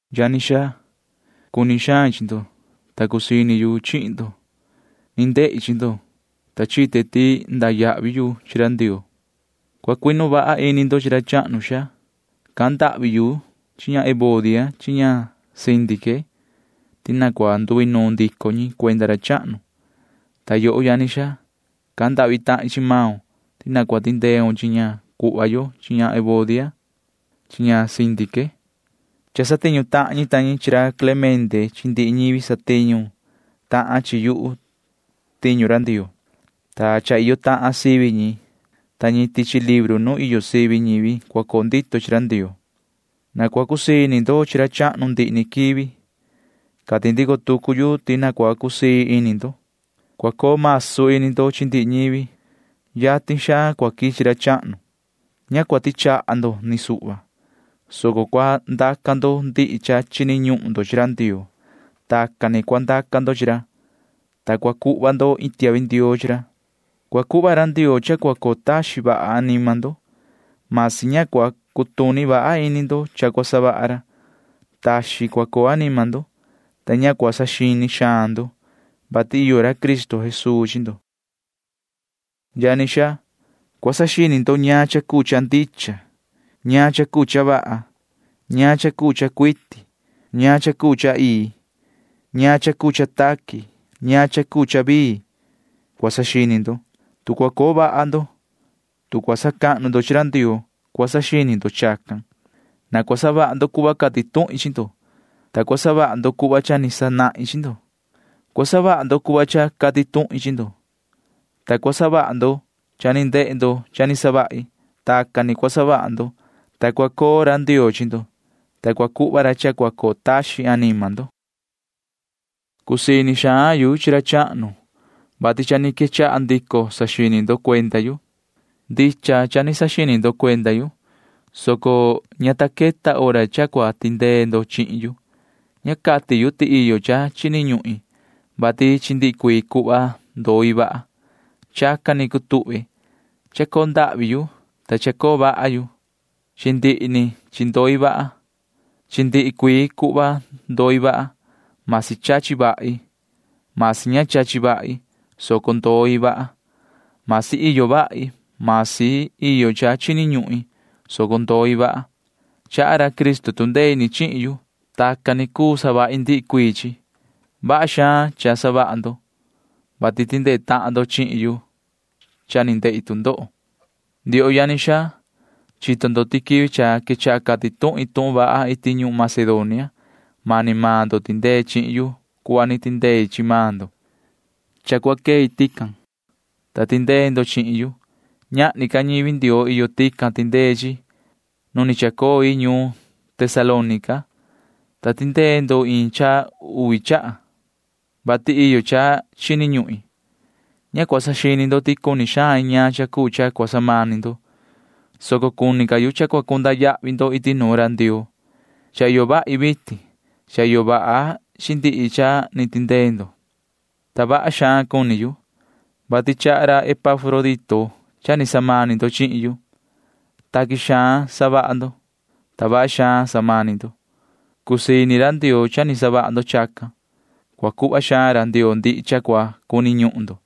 Yani xaa, cuni xain chi ndo, ta cusii ini yu chihin ndo. [Ni ndehi chi ndo,] ta chite ti cha iyo yahvi yu chi ra Ndioo. Cua cuinu vaha ini ndo chi ra chahnu, xaa. Cahan ndahvi yu chi ña Evodia chi ña Síntique ti na cua nduinuun ndico ñi cuenda ra chahnu. Ta yoho yani xaa, cahan ndahvi tahin chi maun ti na cua tindeun chi ña cuhva yo ña Evodia chi ña Síntique. Cha satiñu tahan ñi ta ñi chi ra Clemente chi ndihi ñivi satiñu tahan chi yuhu tiñu ra Ndioo, ta cha iyo tahan sivi ñi ta ñi tichi libru nu iyo sivi ñivi cua coo ndito chi ra Ndioo. Na cua cusii ini ndo chi ra chahnu ndihi ni quivi. Cati ndico tucu yu ti na cua cusii ini ndo. Cua coo masu ini ndo chi ndihi ñivi. Yatin xaan cua quichi ra chahnu. Ña cua tichaha ni ndo ni suhva, soco cua ndaca ndo ndihi cha chini ñuhun ndo chi ra Ndioo. Tacan ni cua ndaca ndo chi ra, ta cua cuhva ndo iin tiahvi ndioo chi ra. Cua cuhva ra Ndioo cha cua coo taxin vaha anima ndo, masi ña cua cutuni vaha ini ndo cha cua savaha ra. Taxin cua coo anima ndo, ta ña cua saxini xaan ndo, vati iyo ra Cristo Jesuu chi ndo. Yani xaa, cua saxini ndo ñaan cha cuu cha ndicha, ñaan cha cuu cha vaha, ñaan cha cuu cha cuiti, ñaan cha cuu cha ii, ñaan cha cuu cha taqui, ñaan cha cuu cha vii cua saxini ndo. Tu cua coo vaha ndo, tu cua sacahnu ndo chi ra Ndioo, cua saxini ndo chacan. Na cua savaha ndo cuhva cati tuhin chi ndo, ta cua savaha ndo cuhva cha ni sanahin chi ndo. Cua savaha ndo cuhva cha cati tuhin chi ndo, ta cua savaha ndo cha ni ndehe ndo cha ni savahi. Tacan ni cua savaha ndo, ta cua coo ra Ndioo chi ndo, ta cua cuhva ra cha cua coo taxin anima ndo. Cusii ini xaan yu chi ra chahnu, vati cha ni quechaha ndico saxini ndo cuenda yu. Ndicha cha ni saxini ndo cuenda yu, soco ña ta queta hora cua tindee ndo chihin yu. Ña cati yu ti iyo cha chini ñuhin, vati chi ndihi cuii cuhva ndoi vaha. Chacan ni cutuhve. Chacoo ndahvi yu, ta chacoo vaha yu. Chi ndihi ni ndoi vaha. Chi ndihi cuii cuhva ndoi vaha. Vasi ndaha ini yu, vasi ña ndaha ini yu, soco ndoi vaha. Vasi iyo vahi, vasi iyo cha chini ñuhin, soco ndoi vaha. Chaha ra Cristo tu ndee ini chihin yu. Tacan ni cuu savahi ndihi cuii chi. Vaha xaan cha savaha ndo, vati tindee tahan ndo chihin yu cha ni ndehi tu ndoho. Ndioho yani xaa, chito ndo ti quivi cha quechaha cati tuhin tuhun vaha iti ñuhun Macedonia can mani maan ndo tindee chihin yu cuhva ni tindei chi maan ndo. Cha cua quei tican, ta tindee ndo chihin yu. Ñahni ca ñivi Ndioo iyo tican tindee. Nu ni chacoi ñuun Tesalónica, ta tindee ndo iin chaha uvi chaha, [vati iyo cha chini ñuhin]. Ña cua saxini ndo ti cuni xain ñaan cha cuu cha cua samani ndo, soco cuni yu cha cua coo ca yahvi ndo iti nuun ra Ndioo. Cha iyo vahi vitin. Cha yaha cuhva cha iyo vaha yu, ta vaha xaan cuni yu, vati chaha ra Epafrodito cha ni samani ndo chihin yu. Taqui xaan savaha ndo, ta vaha xaan samani ndo. Cusii ini ra Ndioo cha ni savaha ndo chacan. Cua cuhva xaan ra Ndioo ndihi cha cua cuni ñuhun ndo,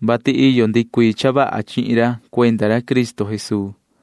vati iyo ndihi cuii cha vaha chihin ra cuenda ra Cristo Jesuu.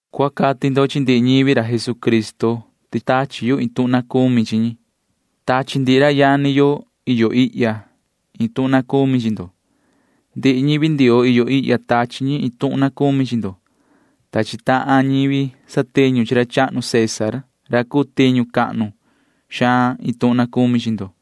Cua cati ndo chi ndihi ñivi ra Jesucristo ti tachi yu iin tuhun na cumi chi ñi. Tachi ndihi ra yani yo iyo ihya iin tuhun na cumi chi ndo. Ndihi ñivi Ndioo iyo ihya tachi iin tuhun na cumi chi ndo. Tachi tahan ñivi satiñu chi ra chahnu César ra cuu tiñu cahnu xaan can iin tuhun na cumi chi ndo.